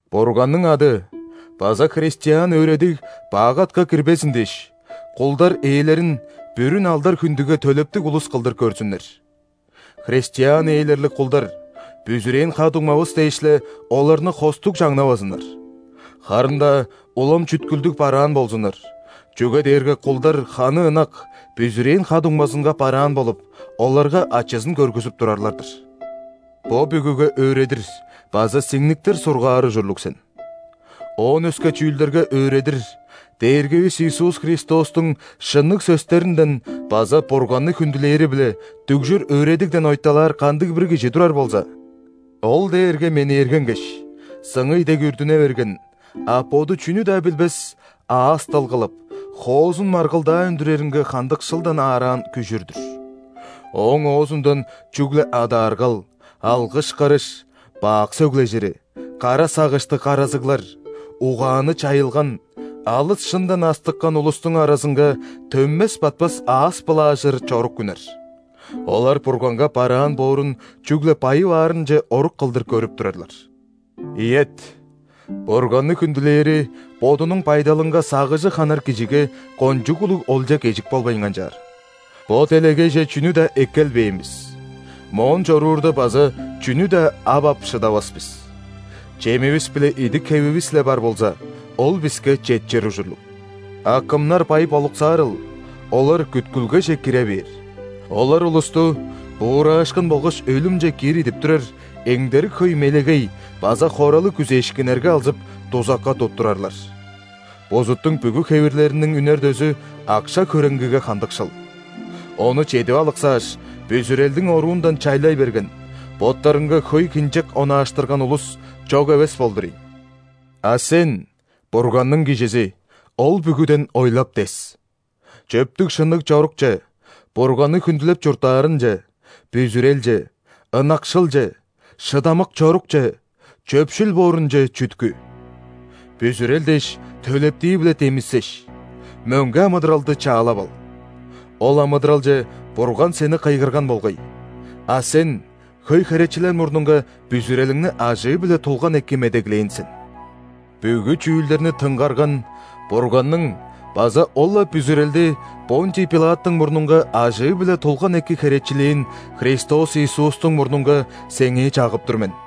Бурганның ады база христиан өөредиг бак атка кирбезин дээш, кулдар ээлерин бүрүн алдар-хүндүге төлептиг улус кылдыр көрзүннер. Христиан ээлерлиг кулдар, бүзүрээн ха-дуңмавыс дээш-ле, оларны хостуг чаңнавазыннар. Харын-даа улам чүткүлдүг бараан болзуннар, чүге дээрге кулдар ханы ынак, бүзүрээн ха-дуңмазынга бараан болуп, оларга ачызын көргүзүп турарлар-дыр. Бо бүгүге өөредир база сиңниктир сургаар ужурлуг сен. Оон өске чүүлдерге өөредир, Дээргивис Иисус Христостуң шынныг сөстеринден база Бурганны хүндүлээри-биле дүгжүр өөредигден ойталаар кандыг-бир кижи турар болза, ол дээрге менээргенгеш, сыңый дег үрдүне берген, а боду чүнү-даа билбес, аас-дыл кылып, хоозун маргылдаа үндүреринге хандыкшылдан аараан күжүр-дүр. Ооң оозундан чүгле адааргал, алгыш-кырыш, бак сөглежири, кара сагыштыг каразыглар; угааны чайылган, алыс шындан астыккан улустуң аразынга төнмес-батпас аас былаажыр чорук үнер. Олар Бурганга бараан боорун чүгле байып аарынче орук кылдыр көрүп турарлар. Ийет, Бурганны хүндүлээри бодунуң байдалынга сагыжы ханар кижиге кончуг улуг олча-кежик болбайн канчаар. Бо делегейже чүнү-даа эккелбээн бис, моон чоруурда база чүнү-даа ап ап шыдавас бис. Чемивис биле идик-хевивис-ле бар болза, ол биске четчир ужурлуг. А кымнар бай болуксаарыл, олар күткүлгеже кире бээр. Олар улусту буураашкын болгаш өлүмче киир идип турар эңдерик хөй мелегей база хоралыг күзээшкиннерге алзып, дузакка туттурарлар. Бузуттуң бүгү хевирлериниң үнер дөзү – акша-хөреңгиге хандыкшыл. Ону чедип алыксааш, бүзүрелдиң оруундан чайлай берген, боттарынга хөй хинчек онааштырган улус чок эвес болдур ийин. А сен, Бурганның кижизи, ол бүгүден ойлап-дес! Чөптүг-шынныг чорукче, Бурганны хүндүлеп чурттаарынче, бүзүрелче, ынакшылче, шыдамык чорукче, чөпшүл боорунче чүткү. Бүзүрел дээш, төлептии-биле демисеш, мөңге амыдыралды чаалап ал. Ол амыдыралче Бурган сени кыйгырган болгай, а сен хөй херечилер мурнунга бүзүрелиңни ажыы-биле тулган эки медеглээн сен. Бүгү чүүлдерни тынгарган Бурганның база ол-ла бүзүрелди ·Понтий Пилаттың мурнунга ажыы-биле тулган эки херечилээн Христос Иисустуң мурнунга сеңээ чагып тур мен: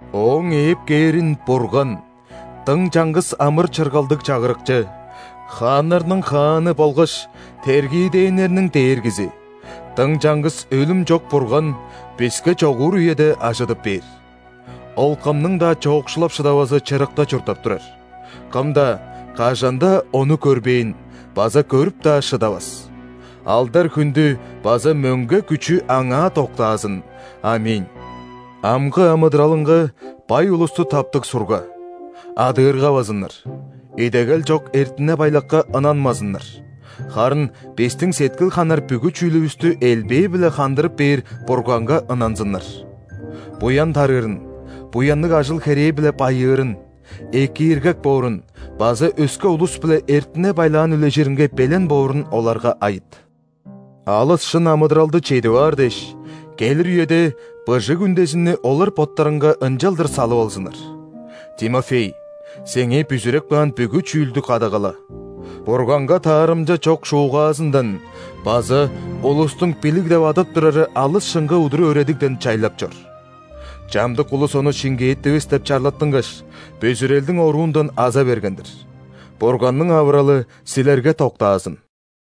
Ооң ээп кээрин Бурган – дың чаңгыс амыр-чыргалдыг Чагырыкчы, хааннарның Хааны болгаш тергиидээннерниң Дээргизи, дың чаңгыс өлүм чок Бурган биске чогуур үеде ажыдып бээр. Ол кымның-даа чоокшулап шыдавазы чырыкта чурттап турар – кым-даа, кажан-даа Ону көрбээн база көрүп-даа шыдавас. Алдар-хүндү база мөңге күчү Аңаа доктаазын! ·Аминь. Амгы амыдыралынга бай улусту таптыг сурга: адыыргавазыннар, идегел чок эртине-байлакка ынанмазыннар, харын бистиң сеткил ханар бүгү чүүлүвүстү элбээ-биле хандырып бээр Бурганга ынанзыннар. Буян тарыырын, буянныг ажыл-херээ-биле байыырын, экииргек боорун база өске улус-биле эртине-байлаан үлежиринге белен боорун оларга айыт. Алыс шын амыдыралды чедип аар дээш, келир үеде быжыг үндезинни олар боттарынга ынчалдыр салып алзыннар. Тимофей, сеңээ бүзүреп каан бүгү чүүлдү кадагала. Бурганга таарымча чок шуугаазындан база улустуң «билиг» деп адап турары алыс шынга удур өөредигден чайлап чор. Чамдык улус ону шиңгээттивис деп чарлаттынгаш, бүзүрелдиң оруундан аза берген-дир. Бурганның авыралы силерге доктаазын!